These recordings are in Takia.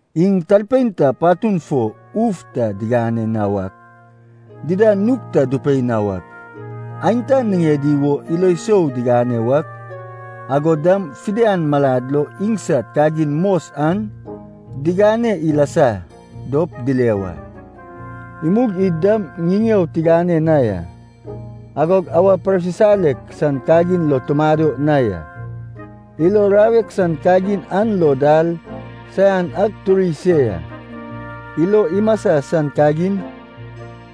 Iŋ talpein ta patun fo uf ta digane na wak, dida nug ta dupei na wak, aenta niŋedi wo ilo sou digane wak, agod dam fidian malad lo iŋsad kagin mos an digane ilasa dop dile wa. Imug id dam ŋiŋeo tigane na ya. Agog awa parsisalek san kagin lo tumado na ya. Ilo rawek san kagin an lo dal saian ak turi se ya. Ilo imasa san kagin,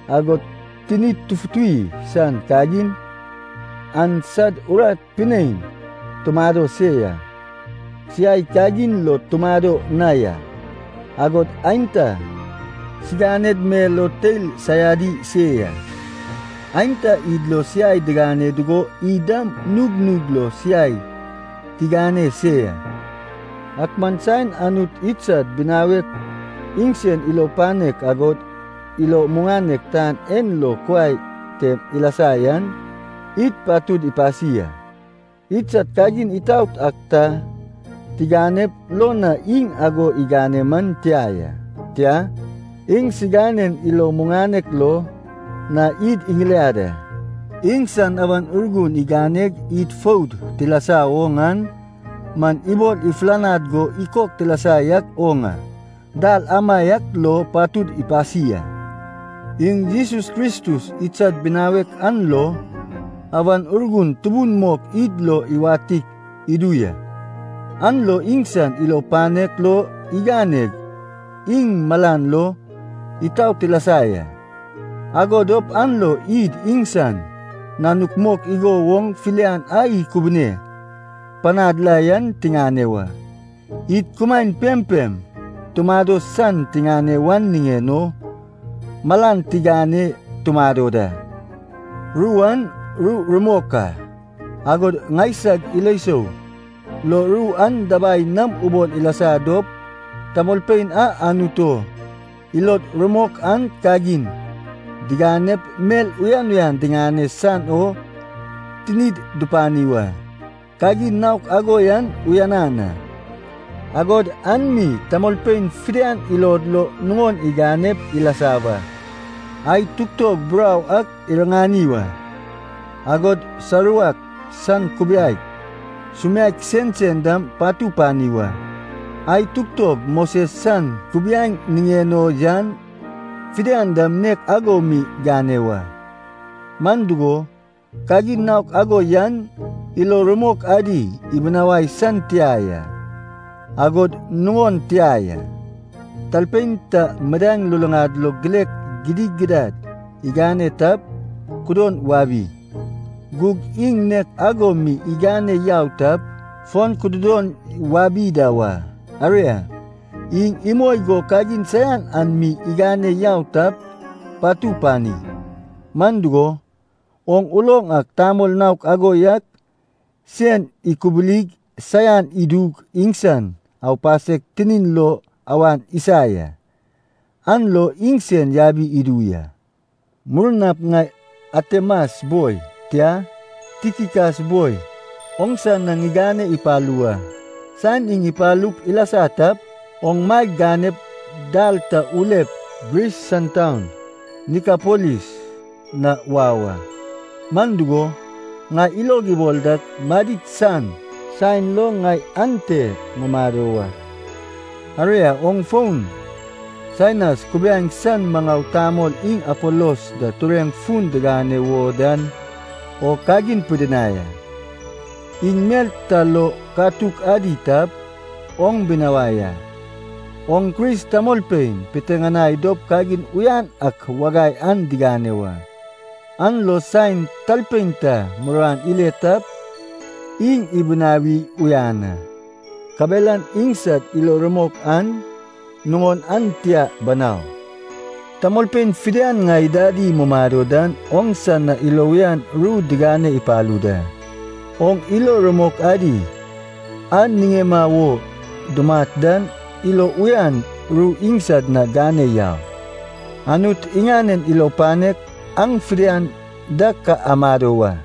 agod tinid tufutuwi san kagin, an sad urat pinein tumado se ya. Siai kagin lo tumado na ya, agod aenta siganed mel o teil saiadi se ya. Aenta id lo siai digane dugo id dam nug nug lo siai tigane se ya. Ak man saen Anut idsad binawek iŋsan ilo panek agod ilo muŋanek tan en lo kuai tem ilasa yan, id patud ipasi a. Idsad kagin itaot ak ta tiganep lo na iŋ ago igane man tia ya. Tia, iŋsiganen ilo muŋanek lo na id iŋiliad a. Iŋsan Awan Urgun iganeg id foud tilasa woŋ an man ibol ifulanad go ikok tilasa yak oŋ a, dal amaiak lo patud ipasi a. Iŋ Jesus Kristus idsad binawek an lo Awan Urgun tubun mok id lo iwatik idu ya. An lo iŋsan ilo panek lo iganeg iŋ malan lo itaot tilasa ya. Ago dop an lo id iŋsan nanuk mok igo woŋ filian a ikubune panad la yan tiŋane wa. Id kumaen pempem tumado san tiŋane wan niŋen o malan tigane tumado da. Ru an ru rumok a. Agod ŋaisag ilo sou lo ru an dabai nam ubol ilasa dop, tamolpein a Anut o ilod rumok an kagin diganep mel uyan uyan digane san o tinid dupani wa. Kagin naok ago yan uyanan a, agod an mi tamolpein fidian ilod lo nuŋon iganep ilasa wa. Ae tugtog burau ak riŋani wa. Agod saruwak san kubiaek, sumiaek sensen dam patu pani wa. Ae tugtog Moses san kubiaeŋ niŋen o yan fidian dam nek ago mi gane wa. Man dugo, kagin naok ago yan ilo rumok adi ibinawai san tia ya, agod nuŋon tia ya. Talpein ta midaeŋ luluŋad lo gilek gidigidad igane tap, kudon wabi. Gug iŋ nek ago mi igane yau tap, fon kududon wabi da wa. Aria, iŋ imoi go kagin saian an mi igane yau tap, patu pani. Man dugo, oŋ uloŋ ak tamol naok ago yak sen ikubulig saian idug iŋsan aupasek tinin lo awan isa ya. An lo iŋsen yabi idu ya. Murnap ŋai Atemas boi, tia, Tikikas boi oŋsa na ŋigane ipalu wa. Saen iŋ ipalup ilasa tap, oŋ maeg ganep dal ta ulep Gris san taun Nikapolis na wau a. Man dugo, ŋai ilog ibol dak madid san saen lo ŋai ante ŋumado wa. Aria, oŋ fon Senas kubiaeŋ san maŋau tamol iŋ Apolos da tureŋ fun digane wo dan o kagin pidinai a. Iŋ mel ta lo katuk adi tap, oŋ binawai a. Oŋ Kris tamolpein piteŋanai dop kagin uyan ak wagai an digane wa. An lo saen talpein ta muruan ile tap, iŋ dibinawi uyan a. Kabelan iŋsad ilo rumok an nuŋon an tia banau. Tamolpein fidian ŋai dadi mumado dan oŋsa na ilo uyan ru digane ipalu da. Oŋ ilo rumok adi a niŋema wo dumat dan ilo uyan ru iŋsad na gane yau. Anut iŋanen ilo panek aŋ fidian da ka amado wa.